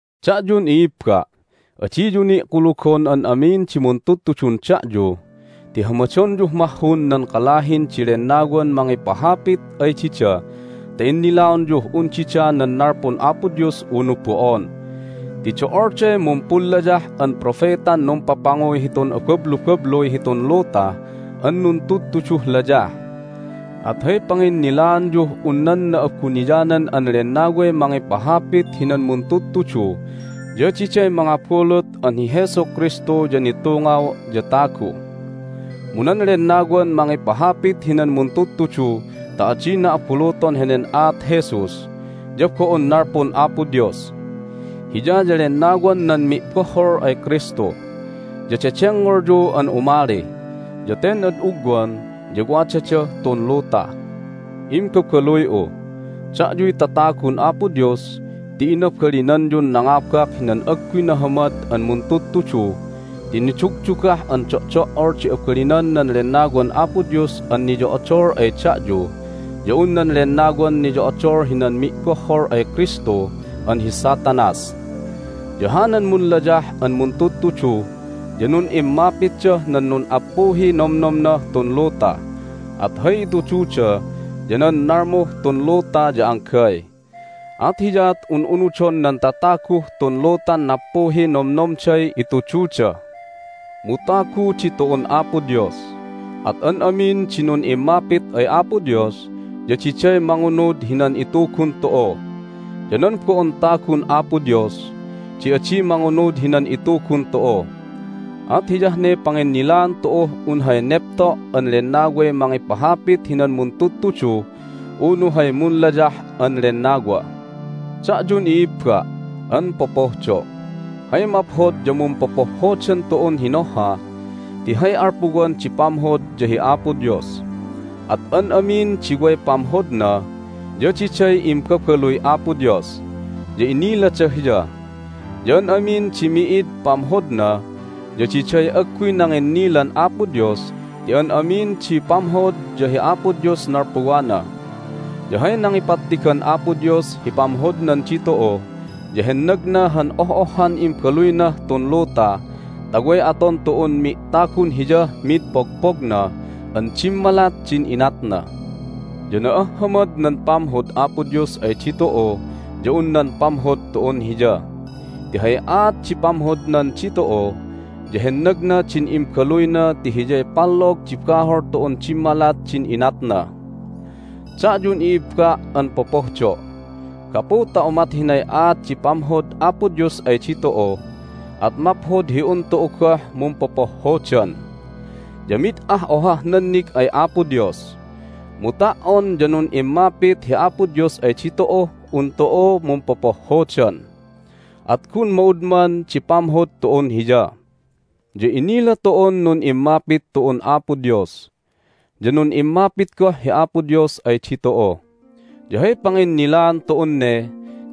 Da'yun i'ibba', adiyu ni' kulugon an amin di muntudtudun da'yu ti hamadonyuh mahhun nan kalahin di lennawan mangipahapit ay dida ta innilaonyuh un dida nan nalpun Apo Dios unu bo'on. Ti do'olday mumpunlayah an propetan numpapanguy hitun abablubabluy hitun luta an nuntudtuduh layah. At hay panginnilaanyuh un nan Na'abuniyanan an Lennaway mangipahapit hinan muntudtudu ya diday mangabulut an hi Jesu Kristu ya nitungaw ya tagu. Mu nan lennawan mangipahapit hinan muntudtudu ta adina abuluton henen aat Jesus ya bo'on nalpun Apo Dios. Hiya ya lennawan nan mi'bohhol ay Kristu, ya dedengngolyu an umali, ya ten ad ugwan ya wadadah tun luta. Imbabaluy'u, da'yuy tatagun Apo Dios ti inabalinanyun nangabak hinan agguy nahamad an muntudtudu ti nidugdugah an do'do'ol di abalinan nan Lennawan Apo Dios an niyo'odol ay da'yu ya un nan lennawan niyo'odol hinan mi'bohhol ay Kristu an hi Satanas! Ya hanan munlayah an muntudtudu ya nun'immapitdah nan nun'appuhiy nomnomnah tun luta, at hay itududa ya nan nalmuh tun luta ya anggay. At hiyaat un unudon nan tataguh tun lutan nappuhiy nomnomday itududa. Mu tagu ditu'un Apo Dios, at an amin di nun'immapit ay Apo Dios ya diday mangunud hinan itugun tu'u. Ya nan bo'on tagun Apo Dios di adi mangunud hinan itugun tu'u. At hiyah ne panginnilaan tu'uh un hay nepto' an Lennaway mangipahapit hinan muntudtudu unu hay munlayah an lennawa. Da'yun i'ibba' an popohdo', hay maphod ya mumpopohhodan tu'un hinohha ti hay alpuwan di pamhod ya hi Apo Dios. At an amin di way pamhodna ya diday imbabaluy Apo Dios, ya inilada Hiya. Ya an amin di mi'id pamhodna ya diday agguy nanginnilan Apo Dios ti an amin di pamhod ya hi Apo Dios nalpuwana. Ya hay nangipattigan Apo Dios hi pamhodnan ditu'u ya hennagna han oh'ohhan Imbaluynah tun luta ta way aton tu'un mi'tagun Hiyah mid pogpogna an dimmalat din inatna. Ya na'ahhamad nan pamhod Apo Dios ay ditu'u ya un nan pamhod tu'un Hiya. Ti hay aat di pamhodnan ditu'u ya hennagna din Imbaluyna ti Hiyay pallog di bahol tu'un dimmalat din inatna. Da'yun i'ibba' an popohdo', gapu ta umat hinay aat di pamhod Apo Dios ay ditu'u at maphod hi un tu'u goh mumpopohhodan. Ya mid ah ohah nannig ay Apo Dios. Mu ta"on ya nun'immapit hi Apo Dios ay ditu'uh un tu'u mumpopohhodan, at gun ma'udman di pamhod tu'un Hiya. Ya inila tu'un nun'immapit tu'un Apo Dios, ya nun'immapit goh hi Apo Dios ay ditu'u. Ya hay panginnilaan tu'un ne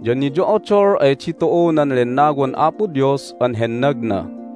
ya niyo'odol ay ditu'u nan Lennawan Apo Dios an hennagna.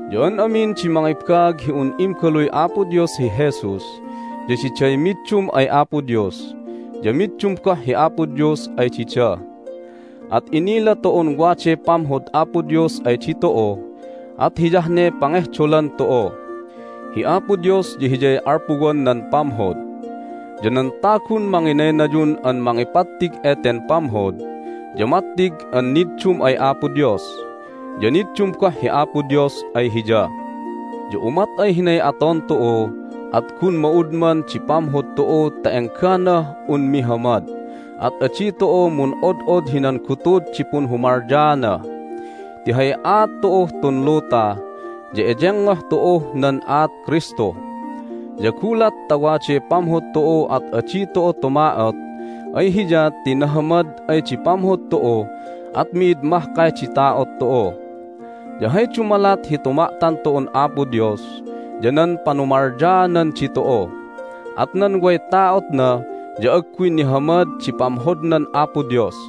Ya an amin di mangibaag hi un Imbaluy Apo Dios hi Jesus ya diday middum ay Apo Dios, ya middum goh hi Apo Dios ay dida. At inila tu'un waday pamhod Apo Dios ay ditu'u, at hiyah ne pangehdolan tu'u. Hi Apo Dios ya Hiyay alpuwan nan pamhod. Ya nan tagun manginaynayun an mangipattig eten pamhod ya mattig an niddum ay Apo Dios, ya niddum goh hi Apo Dios ay hiya. Ya umat ay hinay aton tu'u at gun ma'udman di pamhod tu'u ta engganah un mihamad, at adi tu'u mun'od'od hinan gutud di punhumalyaana, ti hay aat tu'uh tun luta ya eyengngoh tu'uh nan aat Kristu. Ya gulat ta waday pamhod tu'u at adi tu'u tuma'ot ay Hiya ti nahamad ay di pamhod tu'u at mi'id mahkay di ta'ot tu'u. Ya hay dumalat hi tuma'tan tu'un Apo Dios ya nan panumalyaanan ditu'u, at nan way ta'otna ya agguy nihamad di pamhodnan Apo Dios.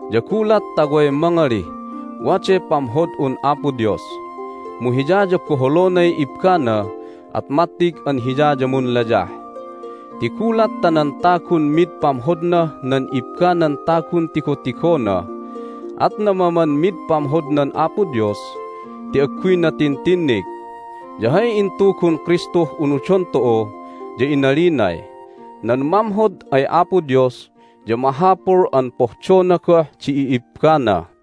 Ya gulat ta way mangalih, "Waday pamhod'un Apo Dios!" mu hiya ya boholonay ibbana at mattig an hiya ya munlayah. Ti gulat ta nan tagun mid pamhodnah nan ibbanan tagun tigotigona at namaman mid pamhodnan Apo Dios ti agguyna tintinnig. Ya hay intugun Kristuh unudon tu'u ya inalinay, "Nan mamhod ay Apo Dios ya mahapul an pohdona goh di i'ibbana."